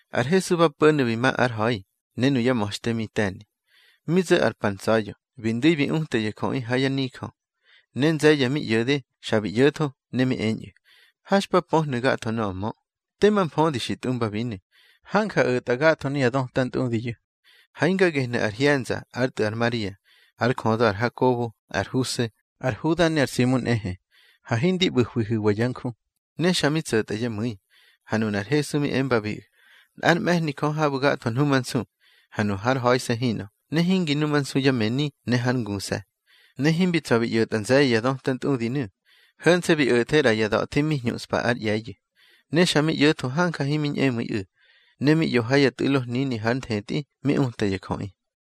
Ar Hesu ba po̱nu̱ bi ma ár ha̱i, ne nuyá ma̱xte mi te̱ni. Mi zo̱ ar pa ntsa̱ya̱, bi ndu̱i bi uta ya jöꞌi ha yá nijö. Ne nze̱ye̱ mi ꞌyo̱de, xa bi ꞌyo̱tho, ne mi eñꞌu̱: —Ha xpa pöhnu̱ gatho nöꞌö mö. Tema mfödi xi tꞌumbabinu̱. Hanja o̱tꞌa gatho nuya döta ntꞌudiyu̱. Ha hinga gehnu̱ ar hye̱nza, ár tꞌu̱ ar Maria, ár jödö ar Hakobo, ar Huse, ar Huda ne ar Simu nꞌehe. Ha hindi ꞌbu̱hwihu̱wa yá nju. Ne xa mi tso̱tꞌa yá mu̱i. Ha nunar Hesu mi embabiꞌu̱: —Nꞌár mꞌe̱hni Jö habu̱ gatho nhumansu, ha nu hár ha̱ise̱ hinꞌö, ne hingi numansu yá mëni, ne hár nguse̱. Ne himbi tsa̱ bi ꞌyo̱tꞌa nze̱ye̱ ya döta ntꞌudinu̱, ho̱nse̱ bi o̱the ꞌra ya da̱thi mi hñuꞌspa ár ꞌye̱yu̱. Ne xa mi ꞌyo̱tho hanja himi ñꞌemu̱iꞌu̱. Ne mi ꞌyo ha ya tꞌu̱lo hnini har nthetꞌi, mi uta ya jöꞌi.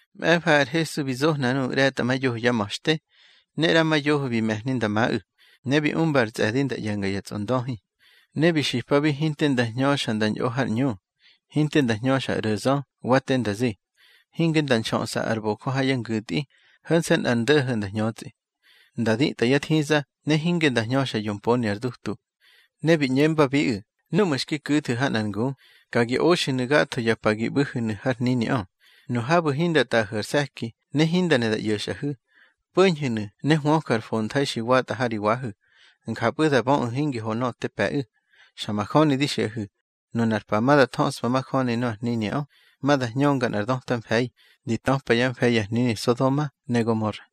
Mꞌe̱fa ar Hesu bi zohna nuꞌu̱ ꞌre̱tꞌamayoho yá ma̱xte, ne ꞌrama yoho bi me̱hni nda maꞌu̱, ne bi umba ar tsꞌe̱di nda ꞌye̱nga ya tsꞌondöhi. Ne bi xipabi hinte nda hñöxa nda ñꞌo har ꞌñu. Hinte nda hñöxa ar ꞌro̱zö, wa te nda zi. Hinge nda nxöꞌsa ar bojö ha yá ngu̱tꞌi, ho̱nse̱ nꞌar ndo̱ho̱ nda hñötsꞌi. Nda ditꞌa yá thiza, ne hinge nda hñöxa yomponi ar dutu. Ne bi ꞌñembabiꞌu̱: —Núꞌmu̱ xki ku̱thu̱ ha nꞌar ngu, ka gi oxu̱nu̱ gatho ya pa gi ꞌbu̱hu̱nu̱ har hniniꞌö. Nu habu̱ hinda tꞌaꞌahu̱ ar se̱ki, ne hinda ne da ꞌyo̱xꞌahu̱, po̱ñhu̱nu̱ ne hwöju̱ ar fontha̱i xi watꞌa ha ri wahu̱. Njapꞌu̱ da böꞌu̱ hingi ho nöꞌö te pe̱ꞌu̱. Xa majöni di xiꞌahu̱, nunar pa ma da thöꞌspa majöni nöꞌö ar hniniꞌö, ma da hñönga nꞌar döta mfe̱i, di töpa yá mfe̱i ya hnini Sodoma ne Gomora.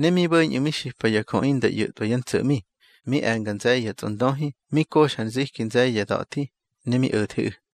Ne mi bo̱ñꞌu̱ mi xipa ya jöꞌi nda ꞌyo̱tꞌwa yá ntso̱ꞌmi. Mi e̱nga nze̱ye̱ ya tsꞌondöhi, mi koxa ar nziki nze̱ye̱ ya da̱thi, ne mi o̱theꞌu̱.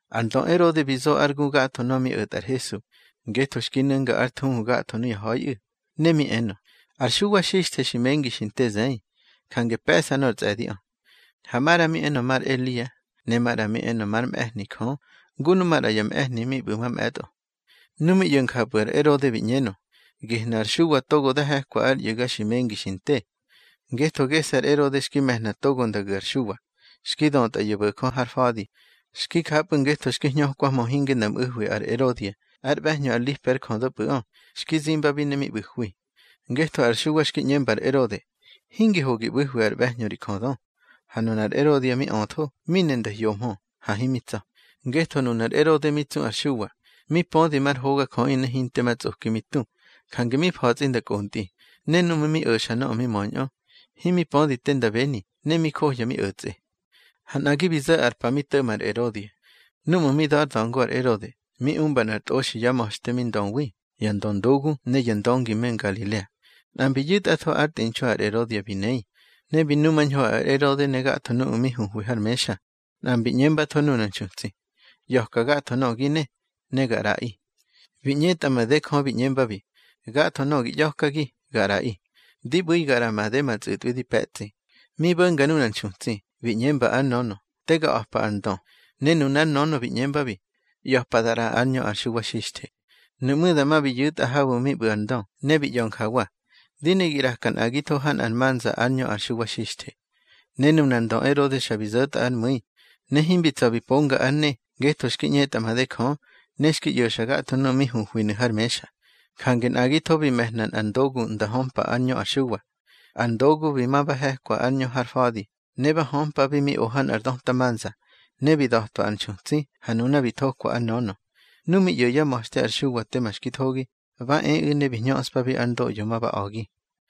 Ar ndö Erode bi zo ár gu gatho nöꞌö mi o̱tꞌa ar Hesu, ngetho xki nu̱nga ár thuhu gatho nuya ha̱iꞌu̱. Ne mi enö: —Ar Xuwa Xixthe xi mengi xi nte zëi, jange pe̱ꞌsa nor tsꞌe̱diꞌö. Ha maꞌra mi enö mar Elia. Ne maꞌra mi enö már mꞌe̱hni Jö, ngu nu maꞌra ya mꞌe̱hni mi ꞌbu̱ mamꞌe̱tꞌo. Nu mi ꞌyo̱ njapꞌu̱ ar Erode bi ꞌñenö: —Gehnu̱ ar Xuwa togo da he̱kwa ár ꞌyu̱ga xi mengi xi nte. Ngetho gese̱ ar Erode xki me̱hna togo nda gu̱ ar Xuwa, xki dötꞌa ya bo̱jö har fa̱di. Xki japꞌu̱ ngetho xki hñökwahmö hinge nda mꞌu̱hwi ar Erodia, ár ꞌbe̱hñö ar Lipe ár jödöpꞌu̱ꞌö, xki zimbabi ne mi ꞌbu̱hwi. Ngetho ar Xuwa xki ꞌñemba ar Erode: —Hingi ho gi ꞌbu̱hwi ár ꞌbe̱hñö ri jödö. Ha nunar Erodia mi öthó, mi ne nda hyohmö, ha himi tsa̱. Ngetho nunar Erode mi tsu ar Xuwa, mi pödi mar hogajöꞌi ne hinte ma tsꞌoki mi tu, jange mi fa̱tsꞌi nda kꞌontꞌi. Ne núꞌmu̱ mi o̱xa nöꞌö mi möñꞌö, himi pödi te nda beni, ne mi johya mi o̱tsꞌe. Ha nꞌagi bi zo̱ ar pa mi to̱ꞌma ar Erodia. Núꞌmu̱ mi da̱ ár da̱ngo ar Erode, mi umba nꞌar tꞌoxi yá ma̱xte mi ndöwi, ya ndöndogu ne ya ndöngi me Ngalilea. Nꞌa mbi yu̱tꞌatho ár tꞌinxu ar Erodia bi nei, ne bi numañho ar Erode ne gatho nuꞌu̱ mi huhwi har mexa. Nꞌa mbi ꞌñembatho nunar nxutsi: —ꞌYa̱ka gatho nöꞌö gi ne, ne ga ꞌraꞌi. Bi ꞌñetꞌa made Jö bi ꞌñembabi: —Gatho nöꞌö gi ꞌya̱kagi, ga ꞌraꞌi. Di ꞌbu̱i ga ꞌraꞌa made ma tsꞌu̱tꞌwi di pe̱tsꞌi. Mi bo̱nga nunar nxutsi, bi ꞌñemba ár nönö: —Te ga a̱pa ar ndö. Ne nunár nönö bi ꞌñembabi: —ꞌYa̱pa da ꞌraꞌa ár ñö ar Xuwa Xixthe. Nuꞌmú̱ dama bi yu̱tꞌa habu̱ mi ꞌbu̱ ar ndö, ne bi ꞌya̱ njawa: —Di ne gi ꞌraka nꞌagitho ha nꞌar manza ár ñö ar Xuwa Xixthe. Ne nunar ndö Erode xa bi zo̱tꞌa ár mu̱i. Ne himbi tsa̱ bi ponga ár ne, ngetho xki ꞌñetꞌa made Jö, ne xki ꞌyo̱xa gatho nuꞌu̱ mi huhwinu̱ har mexa. Jange nꞌagitho bi me̱hna nꞌar ndogu nda hömpa ár ñö ar Xuwa. Ar ndogu bi ma ba he̱kwa ár ñö har fa̱di, ne ba hömpabi mi o ha nꞌar döta manza. Ne bi da̱twa ar nxutsi, ha nuna bi thokwa ár nönö. Nu mi ꞌyo̱ yá ma̱xte ar Xuwa tema xki thogi, ba eꞌu̱ ne bi hñöꞌspa ár ndoꞌyo ma ba a̱gi.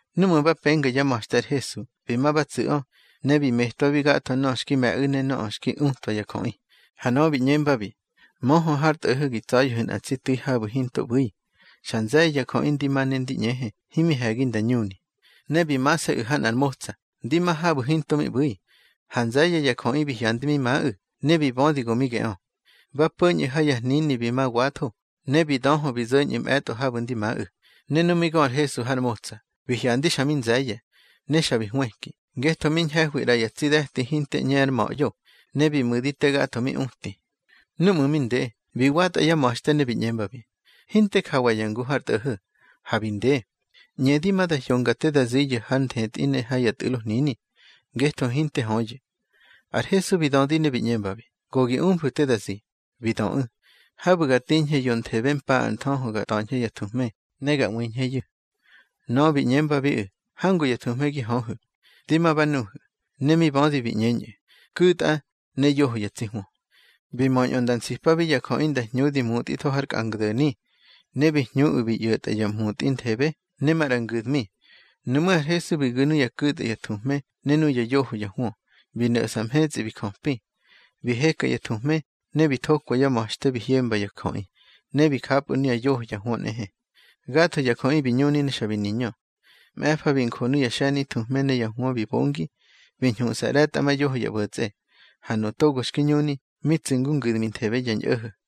Núꞌmu̱ ba penga yá ma̱xte ar Hesu, bi ma ba tsu̱ꞌö, ne bi metwabi gatho nöꞌö xki me̱ꞌu̱ ne nöꞌö xki utwa ya jöꞌi. Ha nöꞌö bi ꞌñembabi: —Möhö har tꞌo̱ho̱ gi tsa̱ya̱hu̱ nꞌa tsi tu̱i habu̱ hinto ꞌbu̱i. Xa nze̱ye̱ ya jöꞌi ndi ma ne ndi ꞌñehe, himi he̱gi nda ñuni. Ne bi mase̱ꞌu̱ ha nꞌar motsa, ndi ma habu̱ hinto mi ꞌbu̱i. Ha nze̱ye̱ ya jöꞌi bi hyandi mi maꞌu̱, ne bi bödi go mi geꞌö. Ba po̱ñꞌu̱ ha ya hnini bi ma watho, ne bi döhö bi zo̱ñꞌu̱ mꞌe̱tꞌo habu̱ ndi maꞌu̱. Ne nu mi gö ar Hesu har motsa, bi hyandi xa mi nze̱ye̱. Ne xa bi hwëki, ngetho mi ñhe̱hwi ꞌra ya tsi de̱ti hinte ꞌñe ár ma̱ꞌyo, ne bi mu̱di te gatho mi uti. Núꞌmu̱ mi nde, bi watꞌa yá ma̱xte ne bi ꞌñembabi: —Hinte jawa ya ngu har tꞌo̱ho̱, ha bi nde. ꞌÑedi ma da hyonga te da ziyu̱ har nthetꞌi ne ya tꞌu̱lo hnini, ngetho hinte höyu̱. Ar Hesu bi dödi ne bi ꞌñembabi: —Go gi umfu̱ te da zi. Bi döꞌu̱: —Habu̱ ga tiñhe yonthebe mpa ar nthöhö ga ta̱ñhe ya thuhme, ne ga ꞌwiñheyu̱. Nöꞌö bi ꞌñembabiꞌu̱: —Hangu ya thuhme gi höhu̱. Dí ma ba nuhu̱. Ne mi bödi bi ꞌñeñꞌu̱: —Ku̱tꞌa, ne yoho ya tsi hwö. Bi möñꞌö nda nsipabi ya jöꞌi nda hñudi mutꞌitho har kꞌangdo̱ni. Ne bi hñuꞌu̱ bi ꞌyo̱tꞌa ya mutꞌi nthebe, ne maꞌra ngu̱dmi. Nuꞌmú̱ ar Hesu bi gu̱ nuya ku̱tꞌa ya thuhme ne nuya yoho ya hwö, bi no̱ꞌsa mhetsꞌi bi jöpi. Bi heka ya thuhme, ne bi thokwa yá ma̱xte bi hyemba ya jöꞌi. Ne bi japꞌu̱ nuya yoho ya hwö nꞌehe. Gatho ya jöꞌi bi ñuni ne xa bi niñö. Mꞌe̱fa bi njo nuya xe̱ni thuhme ne ya hwö bi bongi, bi ñhuꞌsa ꞌre̱tꞌamayoho ya ꞌbo̱tsꞌe. Ha nuꞌu̱ togo xki ñuni, mi tsu̱ ngu ngu̱dminthebe ya ñꞌo̱ho̱.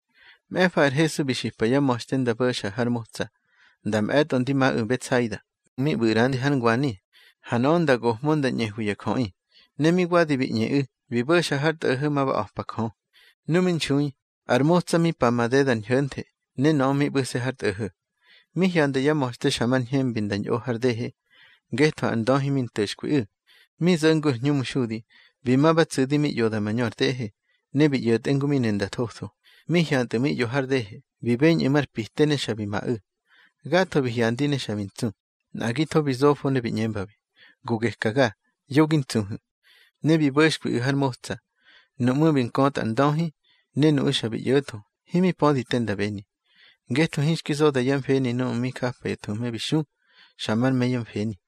Mꞌe̱fa ar Hesu bi xipa yá ma̱xte nda bo̱xa har motsa, nda mꞌe̱tꞌo ndi maꞌu̱ Betsaida, mi ꞌbu̱ ꞌrandi har ngwani. Ha nöꞌö nda gohmö nda ñꞌehwi ya jöꞌi. Ne mi wadi bi ꞌñeꞌu̱, bi bo̱xa har tꞌo̱ho̱ ma ba a̱pa Jö. Nu mi nxui, ar motsa mi pa madeda ar ñho̱nthe, ne nöꞌö mi ꞌbu̱se̱ har tꞌo̱ho̱. Mi hyanda yá ma̱xte xa mar ñhembi nda ñꞌo har dehe, ngetho ar ndöhi mi nto̱xkwiꞌu̱. Mi zo̱ ngu ar hñumxudi, bi ma ba tsu̱di mi ꞌyoda mañö ar dehe, ne bi ꞌyo̱tꞌe ngu mi ne nda thotho. Mi hyantꞌu̱ mi ꞌyo har dehe, bi beñꞌu̱ mar pite, ne xa bi maꞌu̱. Gatho bi hyandi ne xa bi ntsu. Nꞌagitho bi zofo ne bi ꞌñembabi: —Go gekaga, yo gi ntsuhu̱. Ne bi bo̱xkwiꞌu̱ har motsa. Nuꞌmú̱ bi nkötꞌa ar ndöhi, ne nuꞌu̱ xa bi ꞌyo̱tho, himi pödi te nda beni. Ngetho hinxki zoda yá mfeni núꞌmu̱ mi japa ya thuhme bi xu, xa mar me yá mfeni.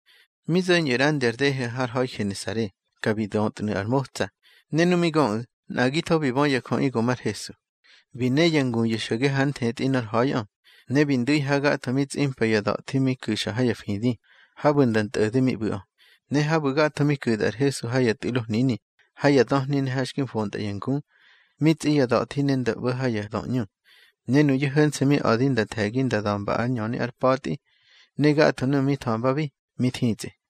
Mi zo̱ñꞌu̱ ꞌrandi ar dehe har ha̱i Genesare, ka bi dötnu̱ ar motsa. Ne nu mi göꞌu̱, nꞌagitho bi bö ya jöꞌi go mar Hesu. Bi ne ya nguyu̱ xo̱ge har nthetꞌi nor ha̱iꞌö, ne bi ndu̱i habu̱ gatho mi tsꞌimpa ya da̱thi mi ku̱xa ha ya fidi, habu̱ nda ntꞌo̱de mi ꞌbu̱ꞌö. Ne habu̱ gatho mi ku̱tꞌa ar Hesu ha ya tꞌu̱lo hnini, ha ya döhni ne ha xki fontꞌa ya ngu, mi tsꞌi ya da̱thi ne nda ꞌbo̱ ha ya döꞌñu. Ne nuyu̱ ho̱nse̱ mi a̱di nda the̱gi nda da̱mba ár ñöni ár pa̱tꞌi, ne gatho nuꞌu̱ mi tha̱mbabi, mi thitsꞌi.